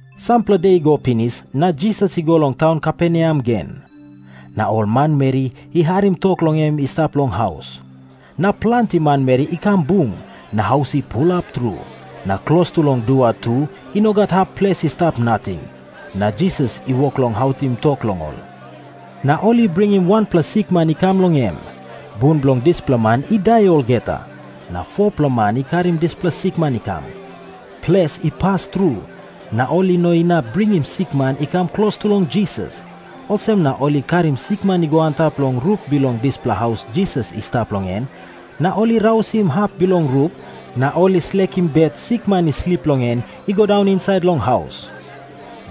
Sampela de i go pinis, na Jisas i go long taun Kaperneam gen. Na ol manmeri i harim tok long em i stap long haus. Na planti manmeri i kam bung, na haus i pulap tru. Na klostu long dua tu i no gat hap ples i stap nating. Na Jisas i wok long autim tok long ol. Na ol i bringim wanpela sikman i kam long em. Bun bilong dispela man i dai olgeta. Na 4-pela man i karim dispela sikman i kam. Ples i pas tru, na ol i no inap bringim sikman i kam klostu long Jisas. Olsem na ol i karim sikman i go antap long rup bilong dispela haus Jisas i stap long en. Na ol i rausim hap bilong rup, na ol i slekim bet sikman i slip long en i go daun insait long haus.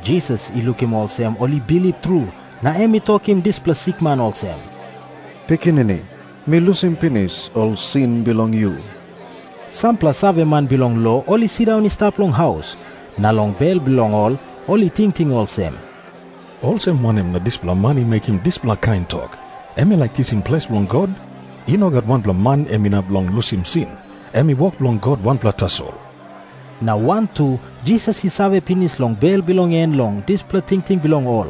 Jisas i lukim olsem ol i bilip tru, na em i tokim dispela sikman olsem, "Pikinini, mi lusim pinis ol sin bilong yu." Sampela saveman bilong lo i sindaun i stap long haus, na long bel bilong ol ol i tingting olsem, "Olsem wanem na dispela man i mekim dispela kain tok? Em i laik kisim ples bilong God. I no gat wanpela man em inap long lusim sin. Em i wok bilong God wanpela tasol." Na wantu Jisas i save pinis long bel bilong en long dispela tingting bilong ol.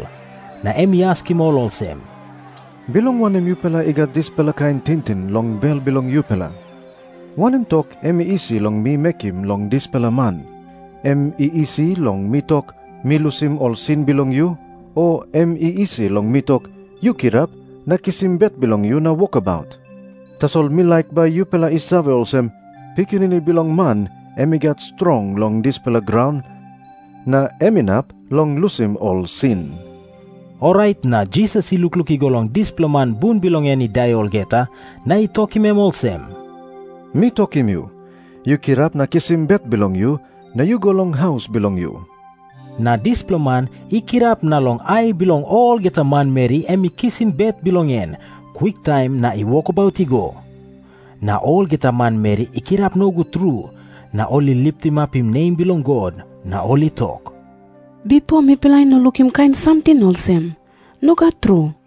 Na em i askim ol olsem, "Bilong wanem yupela i gat dispela kain tingting long bel bilong yupela? Wanem tok em i isi long mi mekim long dispela man? Em i isi long mi tok, 'Mi lusim ol sin bilong yu,' o em i isi long mi tok, 'Yu kirap na kisim bet bilong yu na wokabaut'? Tasol mi laik bai yupela i save olsem, Pikinini Bilong Man em i gat strong long dispela graun, na em inap long lusim ol sin." Orait na Jisas i lukluk i go long dispela man bun bilong en i dai olgeta, na i tokim em olsem, "Mi tokim yu, yu kirap na kisim bet bilong yu, na yu go long haus bilong yu." Na dispela man i kirap na long ai bilong olgeta manmeri em i kisim bet bilong en kwiktaim na i wokabaut i go. Na olgeta manmeri I kirap nogut tru, na ol i litimapim nem bilong God, na ol i tok, "Bipo mipela i no lukim kain samting olsem. Nogat tru."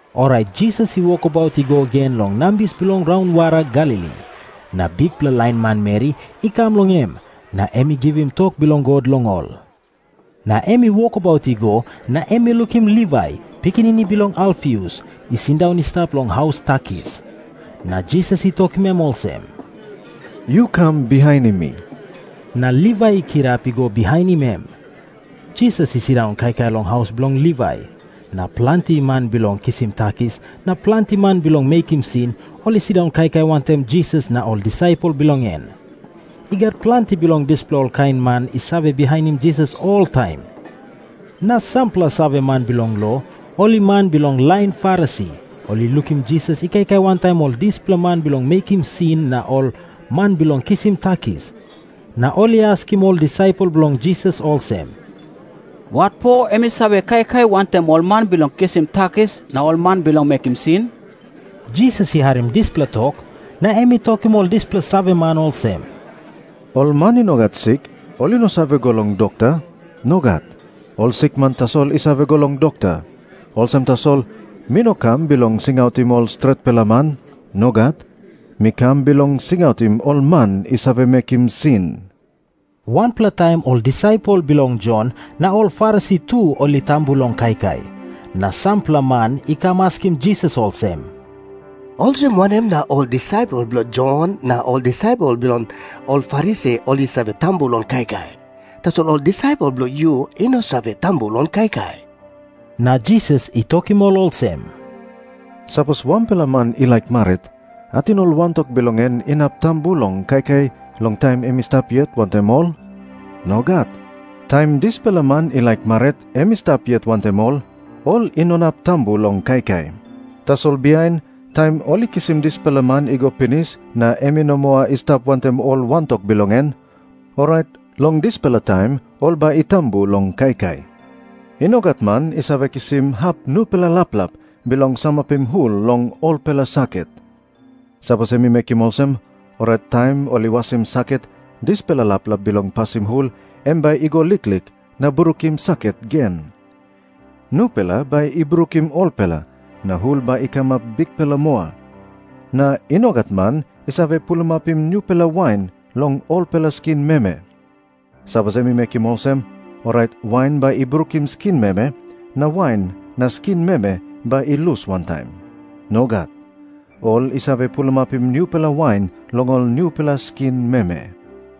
Orait Jisas i wokabaut i go gen long nambis bilong raunwara Galili. Na bikpela lain manmeri i kam long em, na em i givim tok bilong God long ol. Na em i wokabaut i go, na em i lukim Livai, pikinini bilong Alfius, i sindaun i stap long haus takis. Na Jisas I tokim em olsem, "Yu kam bihainim mi." Na Livai i kirap i go bihainim em. Jisas i sindaun kaikai long haus bilong Livai. Na planti man bilong kisim takis na planti man bilong mekim sin, ol i sindaun kaikai wantaim Jisas na ol disaipel bilong en. I gat planti bilong dispela kain man i save bihainim Jisas oltaim. Na sampela saveman bilong lo, ol i man bilong lain Farisi, ol i lukim Jisas i kaikai wantaim ol dispela man bilong mekim sin na ol man bilong kisim takis. Na ol i askim ol disaipel bilong Jisas olsem, "Watpo em i save kaikai wantaim ol man bilong kisim takis na ol man bilong mekim sin?" Jisas I harim dispela tok, na em i tokim ol dispela saveman olsem, "Ol man i no gat sik ol i no save go long dokta. Nogat. Ol sikman tasol i save go long dokta. Olsem tasol, mi no kam bilong singautim ol stretpela man. Nogat. Mi kam bilong singautim ol man i save mekim sin." Wanpela taim ol disaipel bilong Jon na ol Farisi tu ol I tambu long kaikai. Na sampela man i kam askim Jisas olsem, "Olsem wanem na ol disaipel bilong Jon na ol disaipel bilong ol Farisi ol i save tambu long kaikai, tasol ol disaipel bilong yu i no save tambu long kaikai?" Na Jisas i tokim ol olsem, "Sapos wanpela man i laik marit, ating ol wantok bilong en inap tambu long kaikai long taim em i stap yet wantaim ol? Nogat. Taim dispela man i laik marit em i stap yet wantaim ol, ol i no inap tambu long kaikai. Tasol bihain, taim ol i kisim dispela man i go pinis na em i no moa i stap wantaim ol wantok bilong en, orait long dispela taim ol bai i tambu long kaikai. "I no gat man i save kisim hap nupela laplap bilong samapim hul long olpela saket. Sapos em i mekim olsem, orait taim ol i wasim saket dispela laplap bilong pasim hul em bai i go liklik na brukim saket gen. Nupela bai i brukim olpela, na hul bai i kamap bikpela moa. Na i no gat man i save pulimapim nupela wain long olpela skin meme. Sapos em i mekim olsem, orait wain bai i brukim skin meme, na wain na skin meme bai i lus wantaim. Nogat. Ol i save pulimapim nupela wain long ol nupela skin meme."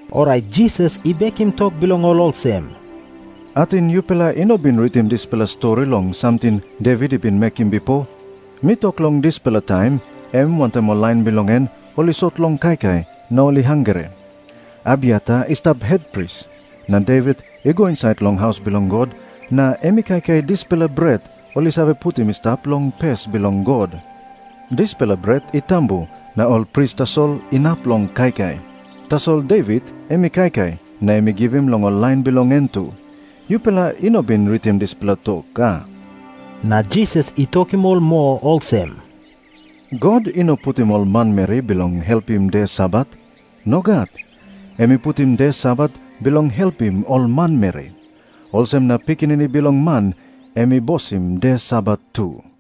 Orait Jisas i bekim tok bilong ol olsem, "Ating yupela i no bin ritim dispela stori long samting Devit i bin mekim bipo? Mi tok long dispela taim em wantaim ol lain bilong en ol i sot long kaikai na ol i hangre. Abiatar i stap hetpris, na Devit i go insait long haus bilong God, na em i kaikai dispela bret ol i save putim i stap long pes bilong God. Dispela bret i tambu, na ol pris tasol inap long kaikai. Tasol Devit em i kaikai, na em i givim long ol lain bilong en tu. Yupela i no bin ritim dispela tok, a?" Na Jisas i tokim ol moa olsem, "God i no putim ol manmeri bilong helpim de Sabat. Nogat. Em i putim de Sabat bilong helpim ol manmeri. Olsem na Pikinini Bilong Man em i bosim de Sabat tu."